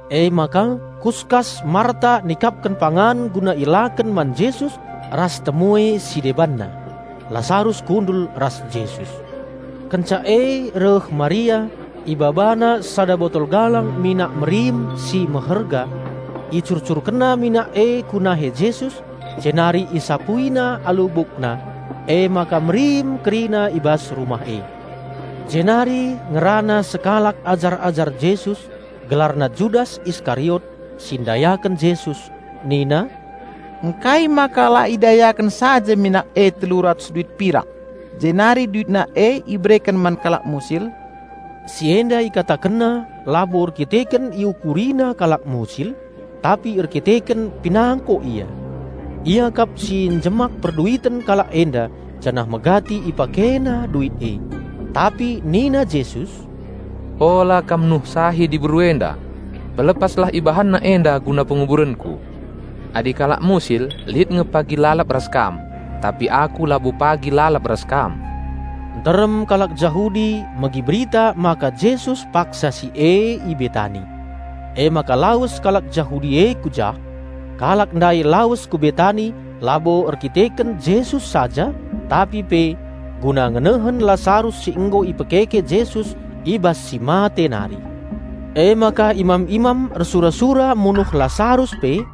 Emaka kuskas Marta nikapken pangan guna ielaken man Jesus ras temue si debanna. Lasarus kundul ras Jesus. Kenca e reh Maria, ibabana sada botol galang minak merim si meherga. Icurcurkenna minak e ku nahe Jesus, jenari isapuina alu bukna. Emaka merim kerina i bas rumah e. Jenari ngerana sekalak ajar-ajar Jesus, gelarna Judas Iskariot (si ndayaken Jesus) nina, "Ngkai maka la idayaken saja minak e telu ratus duit pirak jenari duitna e ibereken man kalak musil?" Si enda ikatakenna labo erdandanken iukurina kalak musil, tapi erdandanken pinangko ia. Ia kap si njemak perduiten kalak enda janah megati ipakena duit e. Tapi nina Jesus, "Ola kam nuhsahi diberu enda! Pelepaslah ibahanna enda guna penguburenKu! Adi kalak musil lit nge pagi lalap ras kam, tapi Aku labo pagi lalap ras kam." Nterem kalak Jahudi megi berita maka Jesus paksa si e i Betani. Emaka lawes kalak Jahudi e ku jah. Kalak ndai lawes ku Betani labo erdandanken Jesus saja, tapi pe guna ngenehen Lasarus si nggo ipekeke Jesus i bas si mate nari. Emaka imam-imam ersura-sura munuh Lasarus pe;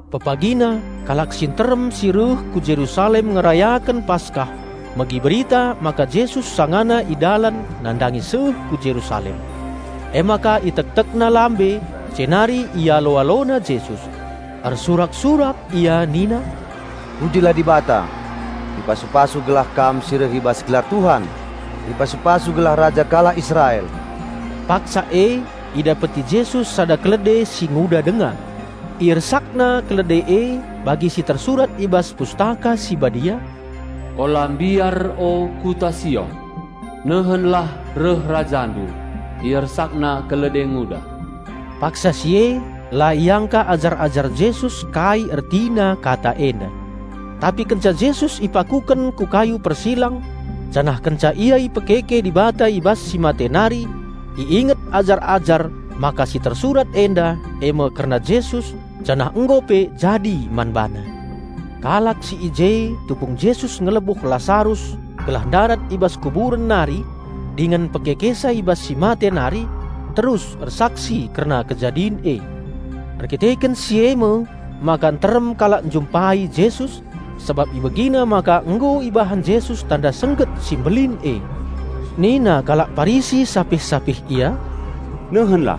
Pepagina kalak si nterem si reh ku Jerusalem ngerayaken Paskah megi berita maka Jesus sangana i dalan nandangi seh ku Jerusalem. Emaka itektekna lambe jenari ialo-alona Jesus. Ersurak-surak ia nina, "Pujilah Dibata! Ipasu-pasu gelah Kam si reh i bas gelar Tuhan! Ipasu-pasu gelah Raja kalak Israel!" Paksa e idapeti Jesus sada kalde si nguda denga. IersakNa kalde e bagi si tersurat i bas Pustaka Si Badia, "Ola mbiar o kuta Sion! Nehenlah reh Rajandu, IersakNa kalde nguda!" Paksa si e la iangka ajar-ajar Jesus kai ertina kata enda. Tapi kenca Jesus ipakuken ku kayu persilang janah kenca Ia ipekeke Dibata i bas si mate nari, iinget ajar-ajar maka si tersurat enda e me kerna Jesus janah nggo pe jadi man BaNa. Kalak si i je tupung Jesus ngelebuh Lasarus gelah ndarat i bas kuburen nari dingen mpekekesa i bas si mate nari terus ersaksi kerna kejadin e. Erdandanken si e me maka nterem kalak njumpai Jesus, sabap ibegina maka nggo ibahan Jesus tanda sengget si mbelin e. Nina kalak Parisi sapih-sapih ia, "Nehenlah,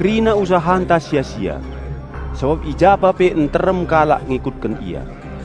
kerina usahanta sia-sia, sabap i ja pa pe nterem kalak ngikutken Ia!"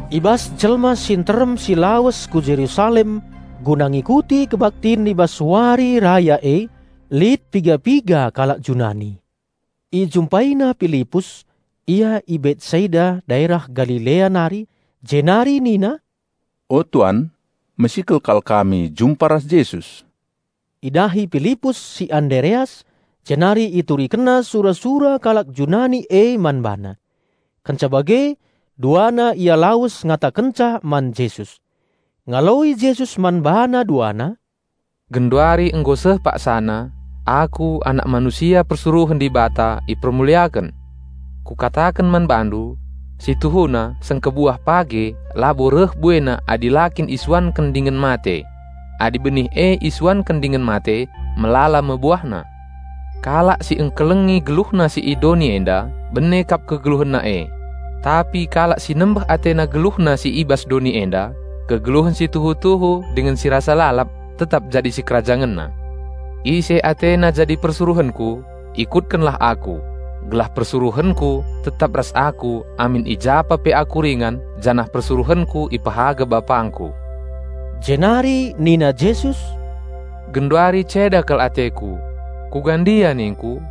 I bas jelma si nterem si lawes ku Jerusalem guna ngikuti kebaktin i bas wari raya e, lit piga-piga kalak Junani. Ijumpaina Pilipus (ia i Betsaida daerah Galilea nari) jenari nina, "O, tuan mesikel kal kami jumpa ras Jesus." Idahi Pilipus si Andereas, jenari iturikenna sura-sura kalak Junani e man bana. Kenca bage duana ia lawes ngatakenca man Jesus. Ngaloi Jesus man bana duana, "Genduari nggo seh paksana, Aku, Anak Manusia persuruhen Dibata ipermuliaken. Kukataken man bandu: Si tuhuna sengkebuah page labo reh buena adi la kin isuanken dingen mate. Adi benih e isuanken dingen mate, melala me buahna. Kalak si engkelengi geluhna si i doni enda, bene kap kegeluhenna e. Tapi kalak si nembeh atena geluhna si i bas doni enda, kegeluhen si tuhu-tuhu dingen si rasa lalap tetap jadi sikerajangenna. Ise atena jadi persuruhenKu, ikutkennalah Aku; gelah persuruhenKu tetap ras Aku amin i japa pe Aku ringan janah persuruhenKu ipehaga BapangKu." Jenari nina Jesus, "Genduari ceda kal ateKu. Kuga ndia ningKu?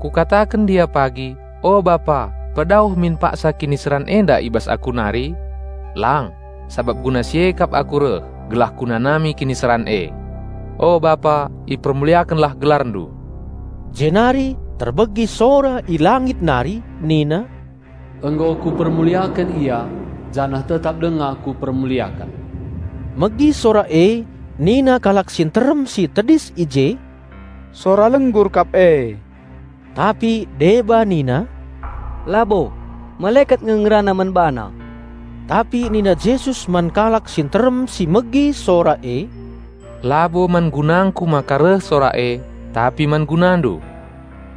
Kukataken ndia pagi, 'O Bapa, pedauh min paksa kiniseran enda i bas Aku nari?' Lang, sabap guna si e kap Aku reh, gelah Kunanami kiniseran e. O Bapa ipermuliakenlah GelarNdu!" Jenari terbegi sora i langit nari Nina, "Nggo Kupermuliaken Ia, janah tetap denga Kupermuliaken." Megi sora e nina kalak si nterem si tedis i je, "Sora lenggur kap e." Tapi deba nina, "Labo! Malekat nge ngerana man BaNa!" Tapi nina Jesus man kalak si nterem si megi sora e, "Labo man gunangKu maka reh sora e, tapi man gunandu.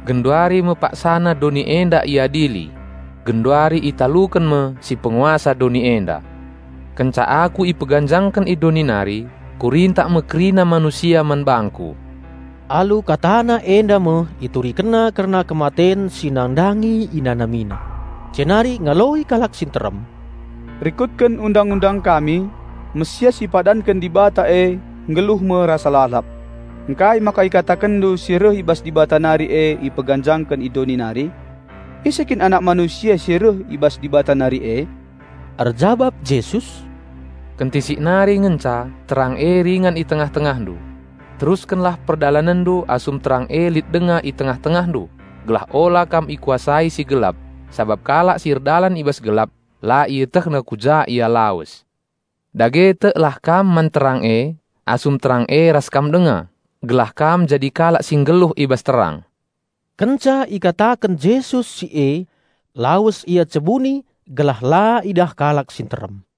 Genduari me paksana doni enda iadili. Genduari italuken me si Penguasa doni enda. Kenca Aku ipeganjangken i doni nari, Kurintak me kerina manusia man bangKu." (Alu KataNa enda me IturikenNa kerna kematen si nandangi InanamiNa.) Jenari ngaloi kalak si nterem, "Rikutken Undang-undang kami, Raja Penampat si ipadanken Dibata e nggeluh me rasa lalap. Ngkai maka IkatakenNdu si reh i bas Dibata nari e ipeganjangken i doni nari? Ise kin Anak Manusia si reh i bas Dibata nari e?" Erjabap Jesus, "Kentisik nari ngenca terang e ringan i tengah-tengahndu. Teruskenlah perdalanenndu asum terang e lit denga i tengah-tengahndu, gelah ola kam ikuasai si gelap; sabap kalak si erdalan i bas gelap, la ietehna ku ja ia lawes. Dage teklah kam man terang e, asum terang e ras kam denga, gelah kam jadi kalak si nggeluh i bas terang." Sabapna kalak Jahudi la tek man Jesus Kenca ikataken Jesus si e, lawes Ia cebuni gelah la idah kalak si nterem.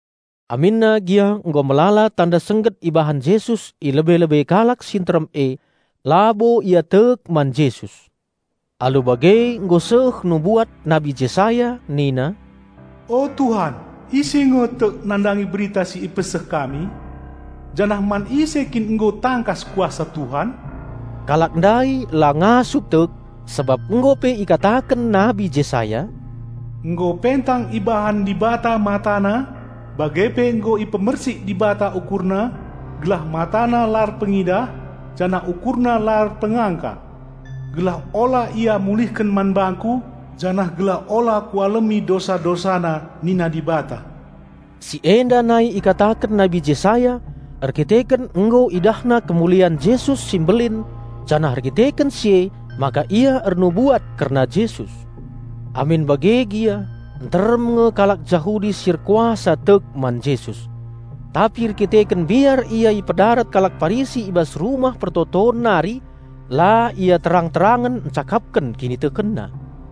Aminna gia nggo melala tanda sengget ibahan Jesus i lebe-lebe kalak si nterem e, labo ia tek man Jesus. Alu bage nggo seh nubuat Nabi Jesaya nina, "O Tuhan ise nge tek nandangi berita si ipeseh kami? Janah man ise kin nggo tangkas kuasa Tuhan?" Kalak ndai la ngasup tek sabap nggo pe ikataken Nabi Jesaya, "Nggo pentang ibahan Dibata matana, bage pe nggo ipemersik Dibata ukurna; gelah matana la erpengidah, janah ukurna la erpengangka. Gelah ola ia mulihken man bangKu janah gelah ola Kualemi dosa-dosana nina Dibata." Si enda nai ikataken Nabi Jesaya erdandanken nggo idahna kemulian Jesus si mbelin janah erdandanken si emaka ia ernubuat kerna Jesus. Amin bage gia nterem nge kalak Jahudi si erkuasa tek man Jesus. Tapi erdandanken mbiar ia ipedarat kalak Parisi i bas Rumah Pertoton nari la ia terang-terangen encakapken kinitekenna.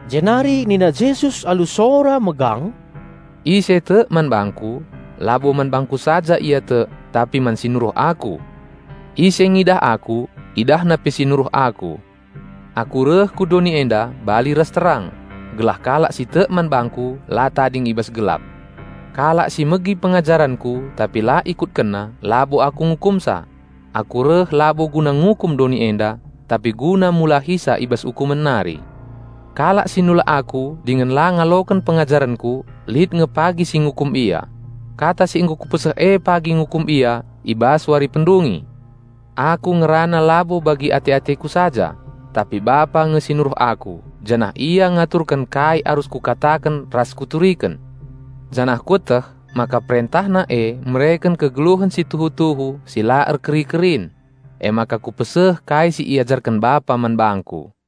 Jenari nina Jesus alu sora megang, "Ise tek man bangKu, labo man bangKu saja ia tek tapi man si nuruh Aku. Ise ngidah Aku, idahna pe si nuruh Aku. Aku reh ku doni enda bali ras terang, gelah kalak si tek man bangKu la tading i bas gelap. Kalak si megi pengajarenKu tapi la ikutkenna, labo Aku ngukumsa. Aku reh labo guna ngukum doni enda, tapi guna mulahisa i bas ukumen nari. Kalak si nulak Aku dingen la ngaloken pengajarenKu lit nge pagi si ngukum ia. Kata si nggo Kupeseh e pagi ngukum ia i bas wari pendungi! Aku ngerana labo bagi ate-ateKu saja, tapi Bapa nge si nuruh Aku, janah Ia ngaturken kai arus Kukataken ras Kuturiken. Janah Kueteh maka perentahna e mereken kegeluhen si tuhu-tuhu si la erkeri-kerin. Emaka Kupeseh kai si iajarken Bapa man Bangku."